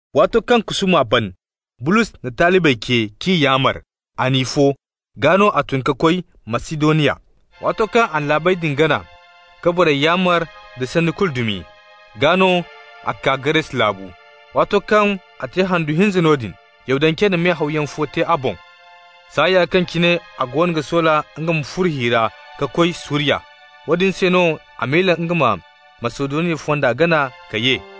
Waato kaŋ kusuuma ban, Bulos na talibey ce k'i yaamar. A n'i fo, gaa no a tun ka koy Masidoniya. Waato kaŋ a na laabey din gana ka borey yaamar da sanni dumi kulu, gaa no a kaa Gares laabu. Waato kaŋ a te handu hinza noodin, Yahudancey na me-hawyaŋ fo te a boŋ saaya kaŋ cine a goono ga soola nga ma furo hi ra ka koy Suriya. Woodin se no a miila nga ma Masidoniya fonda gana ka ye.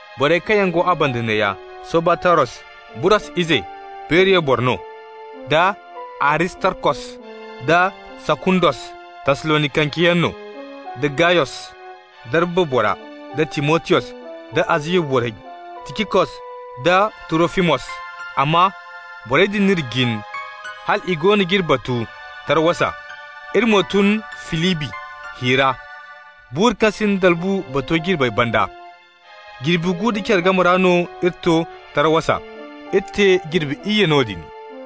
Borey kaŋ yaŋ go a banda neeya: Sobataros, Burros ize, Beriya boro no, da Aristarkos da Sakundos, Tassalonikanceyaŋ no, da Gayos, Darba bora, da Timotiyos, da Aziya borey Ticikos da Turofimos. Amma borey din n'iri jin hal i goono g'iri batu Tarawasa. Iri mo tun Filibi hi ra, buuru kaŋ sinda dalbu bato jirbey banda. Jirbi gu da care game ra no iri to Tarawasa, iri te jirbi iyye noodin.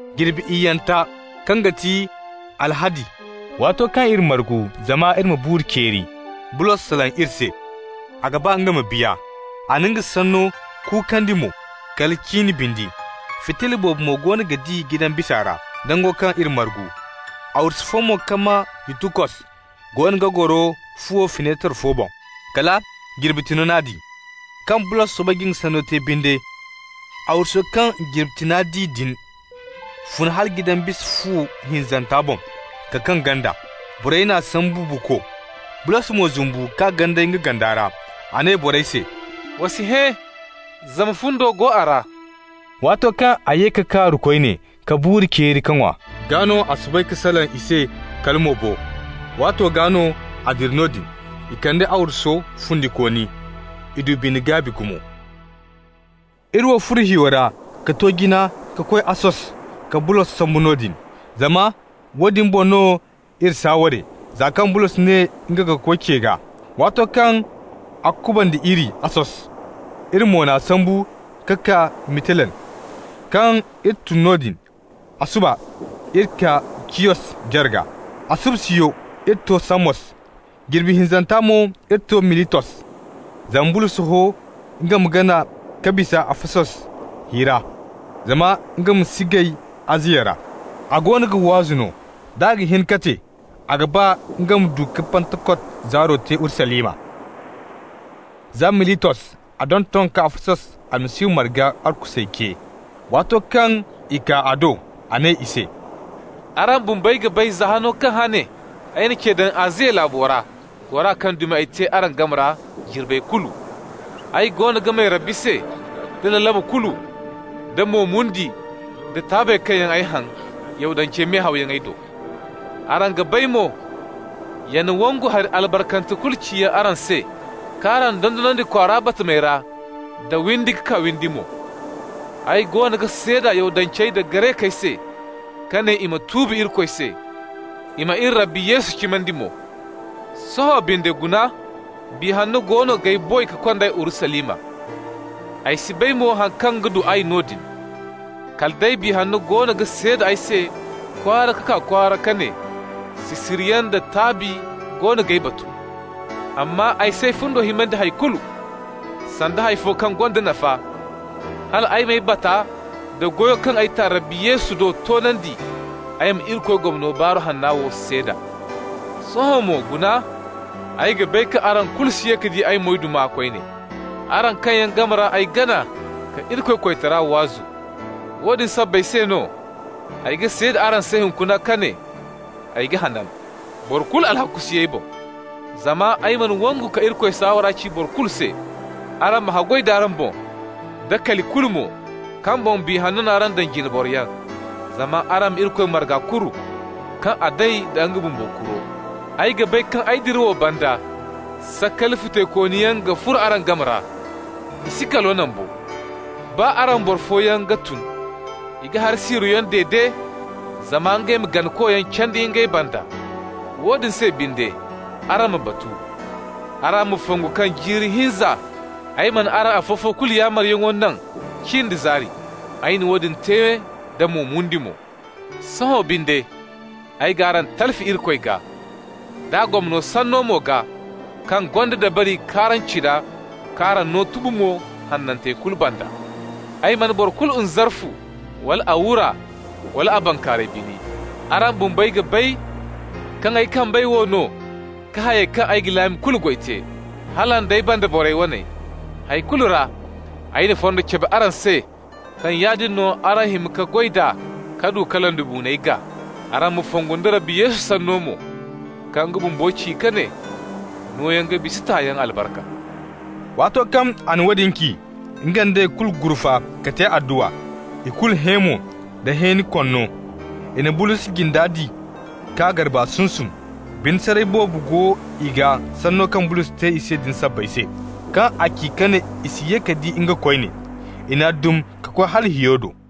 Jirbi iyyanta, kaŋ ga ti alhadi, waato kaŋ iri margu zama iri ma buuru ceeri, Bulos salaŋ i se. A ga ba nga ma biya. A na nga sanno kuukandi mo kala cin bindi. Fitilla boobo mo goono ga di jidan bisa ra, nango kaŋ iri margu. Arwasu fo mo kaŋ maa Yutukos goono ga goro fuwo finetar fo boŋ, kala jirbi tiŋo n'a di. Kaŋ Bulos soobay ka nga sanno te binde, arwaso kaŋ jirbi tiŋa di din fun hala jidan bisa fu hinzanta boŋ ka kaŋ ganda. Borey n'a sambu buuko. Bulos mo zumbu k'a ganday nga ganda ra. A ne borey se: «Wa si hẽ, zama fundo go a ra.» Waato kaŋ a ye ka kaaru koyne, ka buuru ceeri ka ŋwa, gaa no a soobay ka salaŋ i se kala mo bo. Waato gaa no a dira noodin. I kande arwaso fundikooni. I du bine-gaabi gumo. Iri wo furo hiyo ra ka to jina ka koy Assos ka Bulos sambu noodin, zama woodin boŋ no iri saaware, za kaŋ Bulos ne nga ga koy ce gaa. Waato kaŋ a kuband'iri Assos, iri mo n'a sambu ka kaa Mitilen. Kaŋ iri tun noodin, a suba iri kaa Ciyos jarga, a subasiyo iri to Samos, jirbi hinzanta mo iri to Militos. Zama Bulos ho nga ma gana ka bisa Afasos hi ra zama nga ma si gay Aziya ra. A goono ga waasu no. D'a ga hin ka te, a ga ba nga ma du ka Pantakot zaaro te Urusalima. Za Militos a donton ka Afasos Almasihu marga arkusey ce. Waato kaŋ i kaa a do, a ne i se: «Araŋ bumbey ga bay, za hano kaŋ hane ay na ce daŋ Aziya laabo ra, gora kaŋ dumi ay te araŋ game ra jirbey kulu. Ay goono ga may Rabbi se da lalabu kulu, da mo mundi da taabey kaŋ yaŋ ay haŋ Yahudancey me-hawyaŋey do. Araŋ ga bay mo, yana wangu hari albarkante kulu ciyaŋ araŋ se k'araŋ dondonandi kwaara batamey ra da windi ka kaa windi mo. Ay goono ga seeda Yahudancey da Garekey se ka ne i ma tuubi Irikoy se, i ma iri Rabbi Yesu cimandi mo. Sohõ binde guna, Biya Hanno goono g'ay boy ka kond'ay Urusalima. Ay si bay mo haŋ kaŋ ga du ay noodin. Kala day Biya Hanna goono ga seeda ay se kwaara ka kaa kwaara ka ne: sisiriyaŋ da taabi goono g'ay batu. Amma ay s'ay fundo himandi hay kulu, sanda hay fo kaŋ gonda nafa, hal ay m'ay bata nda goyo mo kaŋ ay ta Rabbi Yesu do toonandi, ay ma Irikoy gomno Baaru Hanna wo seeda. Sohõ mo guna, ay ga bay kaŋ araŋ kulu si ye ka di ay moyduma koyne, araŋ kaŋ yaŋ game ra ay gana ka Irikoy koytara waazu. Woodin sabbay se no, ay ga seeda araŋ se hunkuna ka ne: ay ga hanan. Boro kulu alhakku si ay boŋ. Zama ay mana wangu ka Irikoy saawara kulu ci araŋ se. Araŋ ma haggoy d'araŋ boŋ, da kali kulu mo, kaŋ boŋ Biya Hanna n'araŋ daŋ jine boroyaŋ, zama araŋ ma Irikoy marga kuru, kaŋ a day da nga bumbo kuro. Ay ga bay kaŋ ay dirawo banda sakali futaykooniyaŋ ga furo araŋ game ra, i si kalo naŋ bo. Baa araŋ ra boro fooyaŋ ga tun. I ga hari siiroyaŋ dede, zama ngey ma ganakoyaŋ candi ngey banda. Woodin se binde, araŋ ma batu. Araŋ ma fongu kaŋ jiiri hinza ay mana araŋ afo-fo kulu yaamaryaŋo naŋ cin da zaari. Ay na woodin te nda mo mundi mo. Sohõ binde ay g'araŋ talfi Irikoy gaa, d'a gomno sanno mo gaa kaŋ gonda dabari k'araŋ cina k'araŋ no tubu mo hanantey kulu banda. Ay mana boro kulu nzarfu, wala a wura, wala a bankaaray bini. Araŋ bumbey ga bay kaŋ ay kambey wo no ka hayey kaŋ ay ga laami kulu goy te, hala nd'ay banda borey wane. Hay kulu ra ay na fonda cabe araŋ se kaŋ yaadin no araŋ ga hima ka goy d'a ka du ka londibuuney gaa. Araŋ ma fongu nda Rabbi Yesu sanno mo, kaŋ nga bumbo ci ka ne: ‹Nooyaŋ ga bisa tayaŋ albarka.›» Waato kaŋ a na woodin ci, nga nd'ey kulu gurfa ka te adduwa. I kulu hẽ mo da hẽeni konno, i na Bulos jinda di k'a garba sunsum. Bine saray boobo go i gaa sanno kaŋ Bulos te i se din sabbay se, kaŋ a ci ka ne i si ye ka di nga koyne. I n'a dum ka koy hala hiyo do.